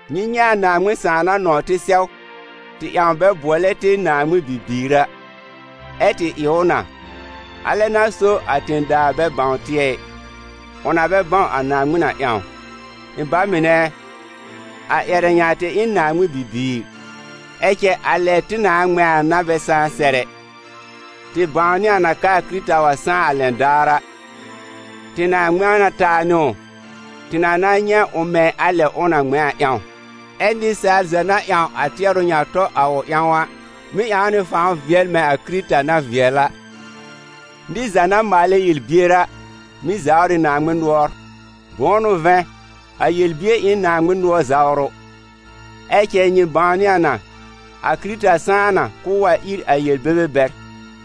Nyɩ nyɛ̃ a Naaŋmɩn Sãà na nɔ̃w tɩ sɛw, tɩ ƴãw bɛ bʋɔlɛ tɩ Naaŋmɩn bibiir a. Ɛ tɩ ɩ ʋ na. A lɛ n'a so a tẽ-daa bɛ bãw tɩ ɛ, ʋ na bɛ bãw a Naaŋmɩn a ƴãw. Ɩ̃ ba mɩnɛ ɛ, a ƴɛrɛ ŋa tɩ ɩ n Naaŋmɩn bibiir, ɛ cɛ a lɛ tɩ nãà ŋmɛ̃ a n'a bɛ sãá sɛr ɛ. Tɩ bãwnɩ a n'a k'aa Kɩrɩta wa sãá a lɛn daar a, tɩ na ŋmɛ̃ na taa nɩ ʋ, tɩ na na nyɛ̃ ʋ mɛ̃ a lɛ ʋ na ŋmɛ̃ a ƴãw. Ɛ nɩsaal za na ƴãw a tɩɛrʋ ŋa tɔ a ʋ ƴãw a, mɩ́ ƴãw nɩ fãw vɩɛl mɛ̃ a Kɩrɩta na vɩɛl a. Nɩr za na maalɛ yel-bier a, mɩ́ zawr ɩ Naaŋmɩn nʋɔr, bʋ̃ʋ n'ʋ vɛ̃, a yel-bier ɩ n Naaŋmɩn nʋɔr zawrʋ. Ɛ cɛ nyɩ bãwnɩ a na, a Kɩrɩta sãá na k'ʋʋ wa ír a yel-bebe bɛr,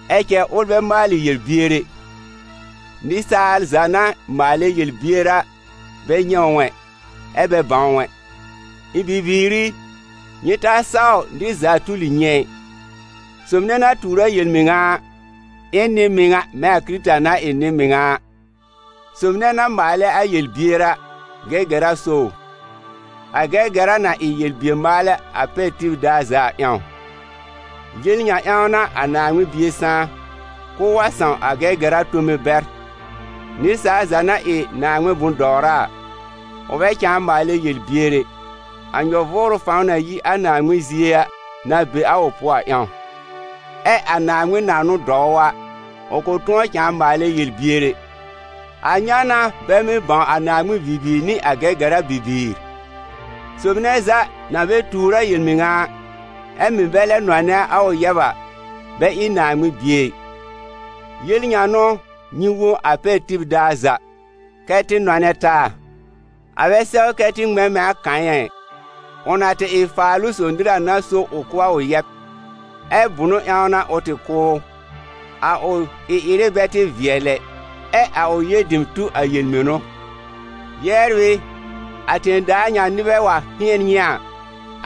ɛ cɛ ʋl bɛ maalɩ yel-bier ɛ. Nɩsaal za na maalɛ yel-bier a bɛ nyɛ̃ ʋ ɛ, ɛ bɛ bãw ʋ ɛ. Ɩ̃ bibiir i, nyɩ ta saw nɩr za tuli nyɩ ɛ. Sob nɛ na tuur a yel-mɩŋa a, ɩ n nɩ-mɩŋa mɛ̃ a Kɩrɩta na ɩ nɩ-mɩŋa a. Sob nɛ na maalɛ a yel-bier a, Gɛgɛra so ʋ. A Gɛgɛra na ɩ yel-bier-maalɛ a pɛr tib daar za a ƴãw. Yel ŋa ƴãw n'a a Naaŋmɩn Bie sãá: k'ʋʋ wa sãw a Gɛgɛra tome bɛr. Nɩsaal za na ɩ Naaŋmɩn bʋ̃-dɔwra a, ʋ bɛ cãa maalɛ yel-bier ɛ, a nyɔ-vʋʋrʋ fãw na yi a Naaŋmɩn zie a na be a ʋ pʋɔ a ƴãw; ɛ a Naaŋmɩn na n'ʋ dɔw ʋ a, ʋ kʋ̃ tʋ̃ɔ cãa maalɛ yel-bier ɛ. A ŋa n'a bɛ mɩ́ bãw a Naaŋmɩn bibiir nɩ a Gɛgɛra bibiir: sob nɛ za na bɛ tuur a yel-mɩŋa a, ɛ mɩ̀ bɛ lɛ nɔnɛ a ʋ yɛb a, bɛ ɩ Naaŋmɩn bie ɩ. Yel ŋa n'ʋ nyɩ wõ a pɛr tib daar za: kɛ́ tɩ nɔnɛ taa. A bɛ sɛw kɛ tɩ ŋmɛ̃ mɛ̃ a Kayɛ̃ a ɩ: ʋ na tɩ ɩ a Faalʋ-sob nɩr a n'a so ʋ kʋ́ a ʋ yɛb. Ɛ bʋ̃ʋ ƴãw n'a ʋ tɩ kʋ́ ʋ? A ʋ ɩ-ɩrɩ bɛ tɩ vɩɛl ɛ, ɛ a ʋ yɛb dem tu a yel-mɩnʋ. Yɛbr ɩ, a tẽ-daa ŋa nɩbɛ wa hɩ̃ɛn nyɩ a,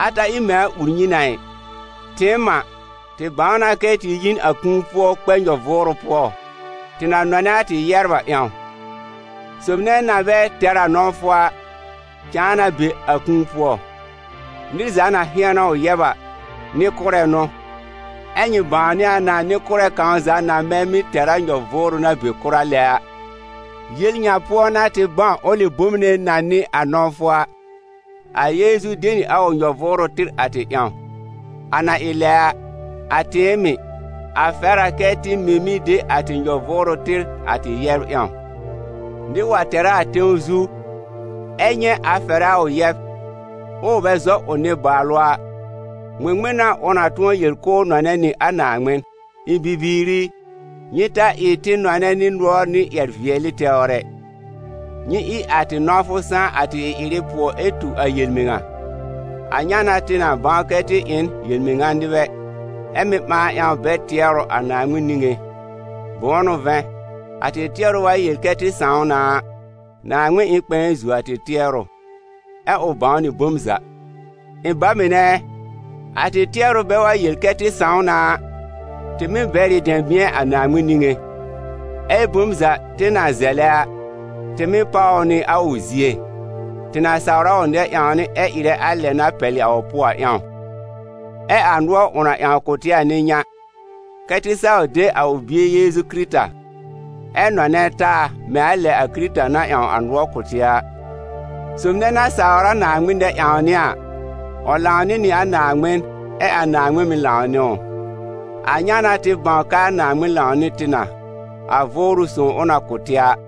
a ta ɩ mɛ̃ a ur nyɩ na ɩ. Tɩɩm a, tɩ bãw na kɛ tɩ yi n a kũu pʋɔ kpɛ nyɔ-vʋʋrʋ pʋɔ, tɩ na nɔnɛ a tɩ yɛbr a ƴãw. Sob nɛ na bɛ tɛr a nɔ̃wfʋ a, cãa na be a kũu pʋɔ. Nɩr za na hɩ̃ɛn a ʋ yɛb a, nɩ-kʋ́rɛ n'ʋ, ɛ́ nyɩ bãwnɩ a na nɩ-kʋ́rɛ kãw za na bɛ mɩ́ tɛr a nyɔ-vʋʋrʋ na be kʋra lɛ a. Yel ŋa pʋɔ n'a tɩ bãw ʋlɩ bom nɛ na n'ɩ a nɔ̃wfʋ a: a Yeezu de nɩ a ʋ nyɔ-vʋʋrʋ tɩr a tɩ ƴãw. A na ɩ lɛ a, a tɩɩm mɩ̀, a fɛr a kɛ tɩ mɩ́ mɩ̀ de a tɩ nyɔ-vʋʋrʋ tɩr a tɩ yɛbr ƴãw. Nɩr wa tɛr a a tẽw zu, ɛ nyɛ̃ a fɛrɛ a ʋ yɛb, ʋʋ bɛ zɔ ʋ nɩ-baalʋ a, ŋmɩŋmɩn n'a ʋ na tʋ̃ɔ yel k'ʋʋ nɔnɛ nɩ a Naaŋmɩn? Ɩ̃ bibiir i, nyɩ ta ɩ tɩ nɔnɛ nɩ nʋɔr nɩ ƴɛr-vɩɛlɩ tɛwr ɛ, nyɩ ɩ a tɩ nɔ̃wfʋ sãá a tɩ ɩ-ɩrɩ pʋɔ ɛ tu a yel-mɩŋa. A ŋa n'a tɩ na bãw kɛ́ tɩ ɩ n yel-mɩŋa nɩbɛ, ɛ́ mɩ́ ɓãa ƴãw bɛr tɩɛrʋ a Naaŋmɩn niŋé. Bʋ̃ʋ n'ʋ vɛ̃, a tɩ tɩɛrʋ wa yel kɛ tɩ sãw na a, Naaŋmɩn ɩ n kpɛ̃ɛ zuo a tɩ tɩɛrʋ, ɛ ʋ bãw nɩ bom za. Ɩ̃ ba mɩnɛ ɛ, a tɩ tɩɛrʋ bɛ wa yel kɛ tɩ sãw na a, tɩ mɩ́ bɛr ɩ dɛ̃bɩ̃ɛ a Naaŋmɩn niŋé. Ɛ bom za tɩ na zɛlɛ a, tɩ mɩ́ páw ʋ nɩ a ʋ zie, tɩ na sawr a ʋ nɛ-ƴãwnɩ ɛ ɩrɛ a lɛ na pɛlɩ a ʋ pʋɔ a ƴãw. Ɛ a nʋɔr ʋ na ƴãw kʋ̀ tɩ a n'ɩ ŋa: kɛ́ tɩ saw de a ʋ Bie Yeezu Kɩrɩta, ɛ nɔnɛ taa mɛ̃ a lɛ a Kɩrɩta na ƴãw a nʋɔr kʋ̀ tɩ a. Sob nɛ na sawr a Naaŋmɩn nɛ-ƴãwnɩ a, ʋ lãwnɩ nɩ a Naaŋmɩn ɛ a Naaŋmɩn mɩ̀ lãw nɩ ʋ. A ŋa n'a tɩ bãw k'aa Naaŋmɩn lãw nɩ tɩ na, a Vʋʋrʋ Sõw ʋ na kʋ̀ tɩ a.